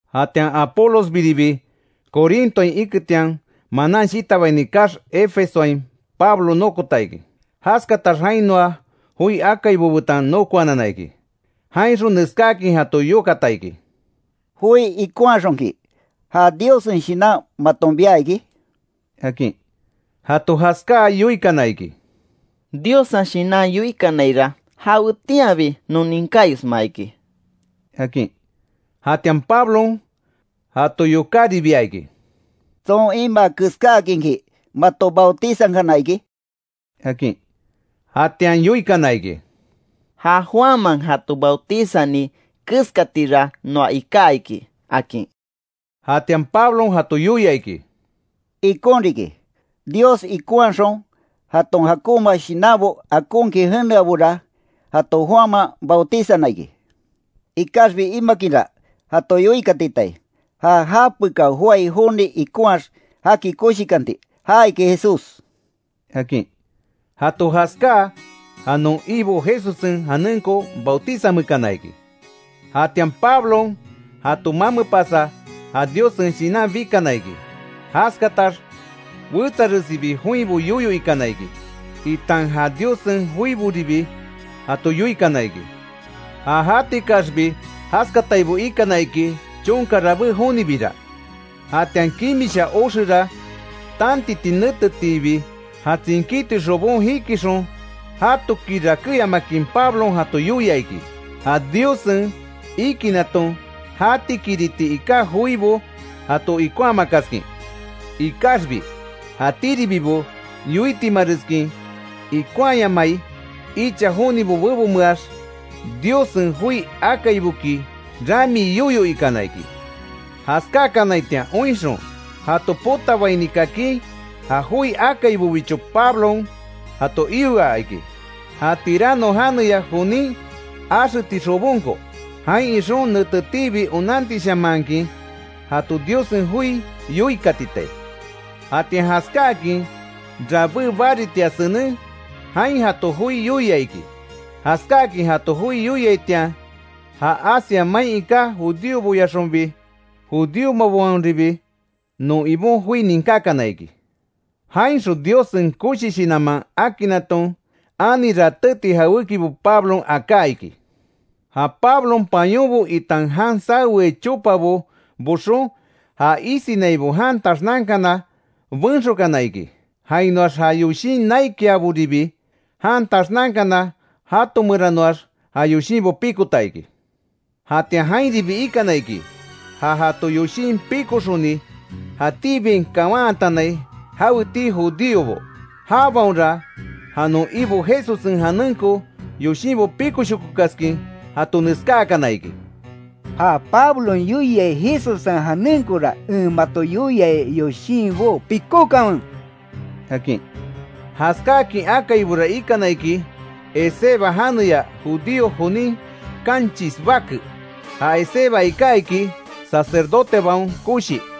Jatian Apolosbiribi Corintoain iketian, manan shitabaini kaax, Efesoain Pablo nokota iki. Jaskatax jainoa joi akaibo betan nokoanana iki. Jainxon neskáakin jato yokata iki: —¿Joi ikonhaxonki, ja Diossen Shinan maton bia iki? —akin. Jato jaskáa, yoikana iki: —Diossen Shinan yoikanaira, jawetianbi non ninkáyosma iki —akin. Jatian Pablon jato yokáribia iki: —¿Tson imaa keskáakinki mato bautizankana iki? —akin. Jatian yoikana iki: —Ja Juanman jato bautizani keskatira noa iká iki —akin. Jatian Pablon jato yoia iki: —Ikon riki, Dios ikonhaxon jaton jakonma shinanbo akonkin jeneabora, jato Juanman bautizana iki. Ikaxbi imakinra, jato yoikatitai, ja japekao joái joni ikonhaax jaki koshikanti ja iki Jesús —akin. Jato jaskáa, ja non Ibo Jesussen janenko bautizanmeekana iki. Jatian Pablon jato mamepasa, ja Diossen Shinan bikana iki. Jaskatax wetsaresibi joinbo yoyo ikana iki itan ja Diossen joiboribi jato yoikana iki. Ja jatikaxbi jaskataibo ikana iki, chonka rabé jonibira. Jatian kimisha oxera tantiti netetiibi, ja tsinkíti xobon jikixon, jatoki rakéyamakin Pablon jato yoia iki, ja Diossen ikinaton jatikiriti iká joibo jato ikonhamakaskin. Ikaxbi, jatíribibo yoitimareskin, ikonhaayamai icha jonibo bebonmeax, Diossen joi akaiboki ramii yoyo ikana iki. Jaskákanaitian oinxon, jato potabaini kakin, ja joi akaibobicho Pablon jato ioa iki, ja Tirano janeya jonin axeti xobonko. Jain ixon netetiibi onantishamanhakin jato Diossen joi yoikatitai. Jatian jaskáakin rabé baritia senen, jain jato joi yoia iki. Jaskáakin jato joi yoiaitian, ja Asia main iká judíoboyaxonbi judíomabaonribi non Ibon joi ninkákana iki. Jainxon Diossen koshi shinanman akinnaton, ani ratéti jawékibo Pablon aká iki. Ja Pablon pañonbo itan jan saweai chopabo boxon, ja isinaibo jan taxnankana, benxokana iki. Jainoax ja yoshin naikiaboribi jan taxnankana, jatomeranoax ja yoshinbo pikota iki. Jatian jainribi ikana iki, ja jato yoshin pikoxoni jatíbiain kawantanai jawetii judíobo. Jabaonra, ja non Ibo Jesussen janenko yoshinbo píkoshokokaskin jato neskáakana iki: “¡Ja Pablon yoiai Jesussen janenkora en mato yoiai yoshinbó, pikókanwe!” akin. Jaskáakin akaibora ikana iki, Esceva janeya judío jonin kanchis bake. Ja Esceva iká iki sacerdotebaon koshi.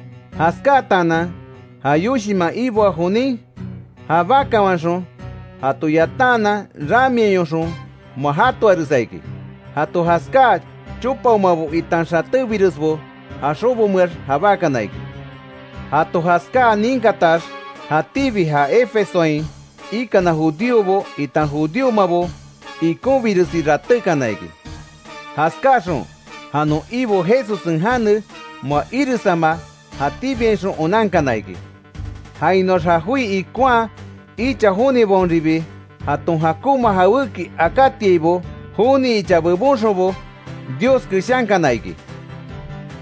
Jaskátaanan, ja yoshinman iboa jonin, jabákawanxon jato yatantaanan, ramiayoxon moa jatoaresa iki. Jato jaskáa chopaomabo itan xatébiresbo ja xobomeax jabákana iki. Jato jaskáa ninkatax, jatíbi ja Efesoain ikana judíobo, itan judíomabo ikonbiresi ratékana iki. Jaskaxon ja non Ibo Jesussen jane, moa iresama jatíbiainxon onankana iki. Jainoax ja joi ikonhaa icha jonibaonribi, jaton jakonma jawéki akátiaibo, joni icha bebonxonbo Dios keshankana iki.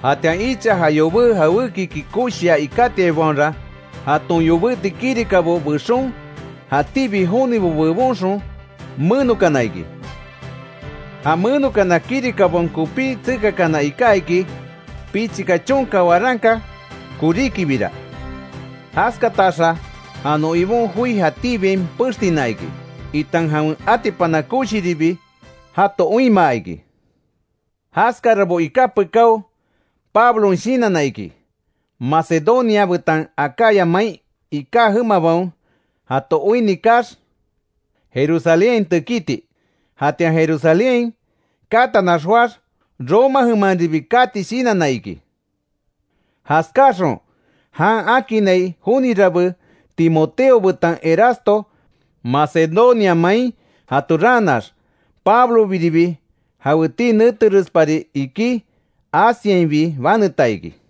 Jatian icha ja yobé jawékiki koshia ikátiaibaonra jaton yobéti kirikabo bexon, jatíbi jonibo bebonxon menokana iki. Ja menokana kirikabaon kopí tsekakana iká iki, pichika chonka waranka koríkibira. Jaskataxa ja non Ibon joi jatíbiain pextina iki, itan jawen atipana koshiribi jato oinmaa iki. Jaskarabo iká pekáo, Pablon shinanna iki, Macedonia betan Acaya main iká jemabaon jato oinni kaax, Jerusalénhain tekíti. Jatian Jerusalénhain katanax joáx, Roma jemanribi kati shinanna iki. Jaskáxon jan akinnai joni rabé, Timoteo betan Erasto Macedonia main jato raanax, Pablobiribi jawetii neterespari ikí, Asiainbi baneta iki.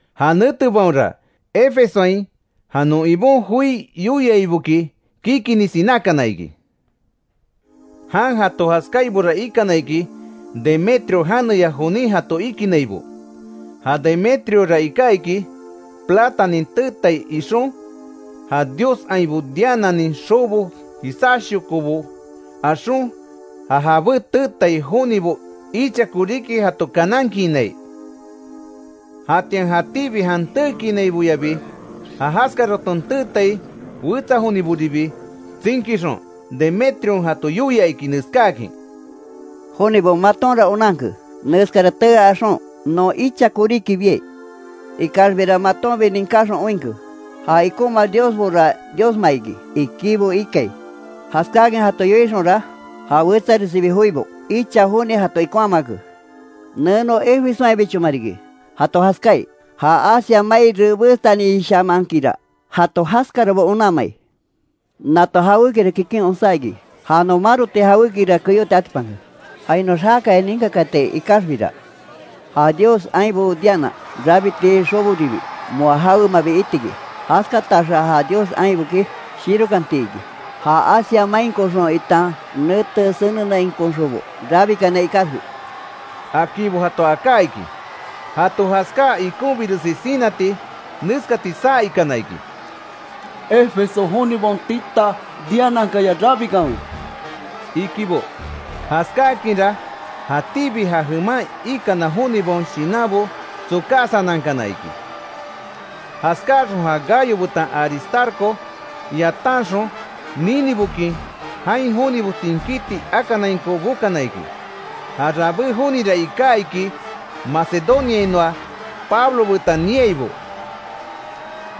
Ja netebaonra Efesoain, ja non Ibon joi yoiaiboki kikini sinákana iki. Jan jato jaskáaibora ikana iki, Demetrio janeya jonin jato ikinaibo. Ja Demetriora iká iki, platanin teetai ixon, ja dios ainbo Diananin xobo jisáshokobo axon, ja jabé teetai jonibo icha koríki jato kanankiinai. Jatian jatíbi jan teekiinaiboyabi, ja jaskaraton teetai wetsa joniboribi tsinkixon, Demétrion jato yoia iki neskáakin: “Jonibo, matonra onanke neskara tee axon non icha koríki biai. Ikaxbira matonbi ninkáxon oinke, ja ikonma diosbora diosma iki, ikibo ikai. Jaskáakin jato yoixonra, ja wetsaresibi joibo icha joni jato ikonhamake. Neno Efesoainbichoma riki, jato jaskáai, ja Asia mai rebestanishamankinra jato jaskarabo onanmai. Nato jawékira kikin onsá iki, ja non maroti jawékira keyóti atipanke, jainoax jákaya ninkakaatai ikaxbira, ja dios ainbo Diana rabiti xoboribi moa jawemabi iti iki, jaskataxa ja dios ainboki shirokanti iki, ja Asia mainkoxon itan nete senenainkoxonbo rabikanai ikaxbi”, akinbo jato aká iki. Jato jaskáa ikonbiresi sinati, neskati saa ikana iki: “¡Efeso jonibaon tita Dianakaya rabikanwe!” ikibo. Jaskáakinra, jatíbi ja jeman ikana jonibaon shinanbo tsokasanankana iki. Jaskáxon ja Gayo betan Aristarco yatanxon ninibokin, jain jonibo tsinkíti akanainko bokana iki. Ja rabé jonira iká iki Macedoniainoa, Pablo betan niaibo.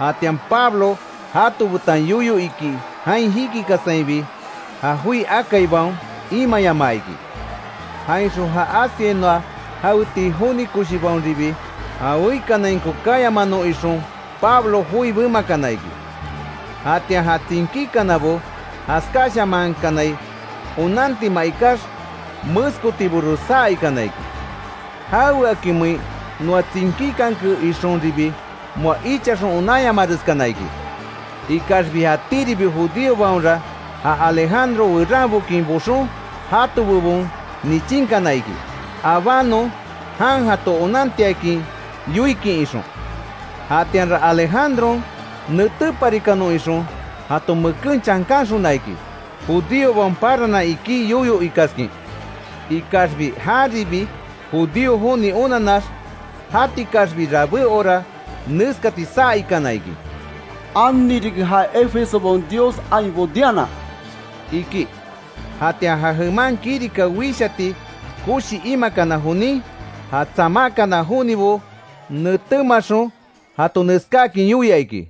Jatian Pablo jato betan yoyo iki jain jikikasainbi, ja joi akaibaon imayamaa iki. Jainxon ja Asiainoa jawetii joni koshibaonribi, ja weikanainko kayamanon ixon Pablo joi bemakana iki. Jatian ja tsinkíkanabo jaskáshamankanai onantima ikax, meskotibores saa ikana iki: Jaweakimein noa tsinkíkanke ixonribi moa ichaxon onanyamareskana iki. Ikaxbi jatíribi judíobaonra, ja Alejandro weranbokin boxon, jato bebon nichinkana iki, abanon jan jato onantiakin yoikin ixon. Jatianra Alejandron, netéparikanon ixon jato meken chankanxona iki, judíobaon paranan ikí yoyo ikaskin. Ikaxbi járibi judío joni onanax, jatikaxbi rabé hora neskati saa ikana iki: “¡Ani riki ja Efesobaon dios ainbo Diana!” iki. Jatian ja jeman kirika wishati koshi imakana jonin, ja tsamákana jonibo netémaxon jato neskáakin yoia iki: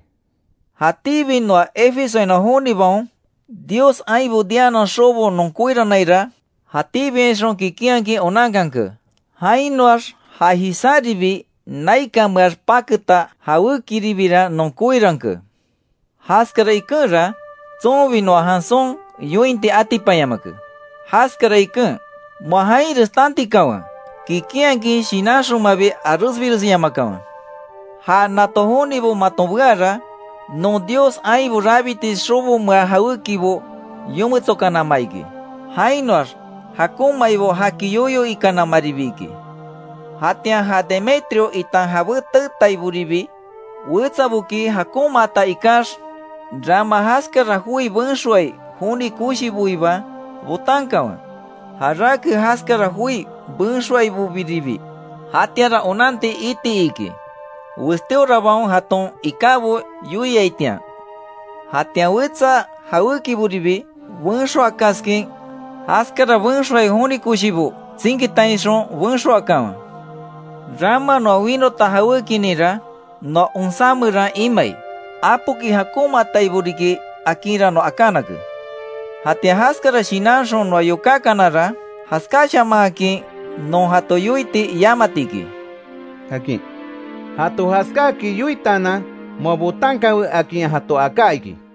“Jatíbi noa Efesoainoa jonibaon, dios ainbo Dianan xobo non koiranaira jatíbiainxon kikinhakin onanke. Jainoax ja jisáribi naikanmeax paketa jawékiribira non koiranke. Jaskara ikenra, tsonbi noa janson yointi atipanyamake. Jaskara iken, moa jainres tantikanwe. Kikinhakin shinanxonmabi aresbiresyamakanwe. Ja nato jonibo maton beara, non dios ainbo rabiti xobomea jawékibo yometsokanama iki; jainoax jakonmaibo jaki yoyo ikanamaribi iki. Jatian ja Demetrio itan jabé teetaiboribi, wetsaboki jakonmaata ikax, rama jaskara joi benxoai joni koshiboiba botankanwe, jarake jaskara joi benxoaibobiribi. Jatianra onanti iti iki, westíorabaon jaton ikábo yoiaitian. Jatian wetsa jawékiboribi benxoakaskin, jaskara benxoai joni koshibo tsinkitainxon benxoakanwe. Rama noa winota jawékininra, noa onsá meran imai; apoki jakonmaataibo riki akinra noa akánake. Jatian jaskara shinanxon noa yokákanara, jaskáshamanhakin non jato yoiti yamati iki”, akin. Jato jaskáakin yoitaanan, moa botankanwe akin jato aká iki.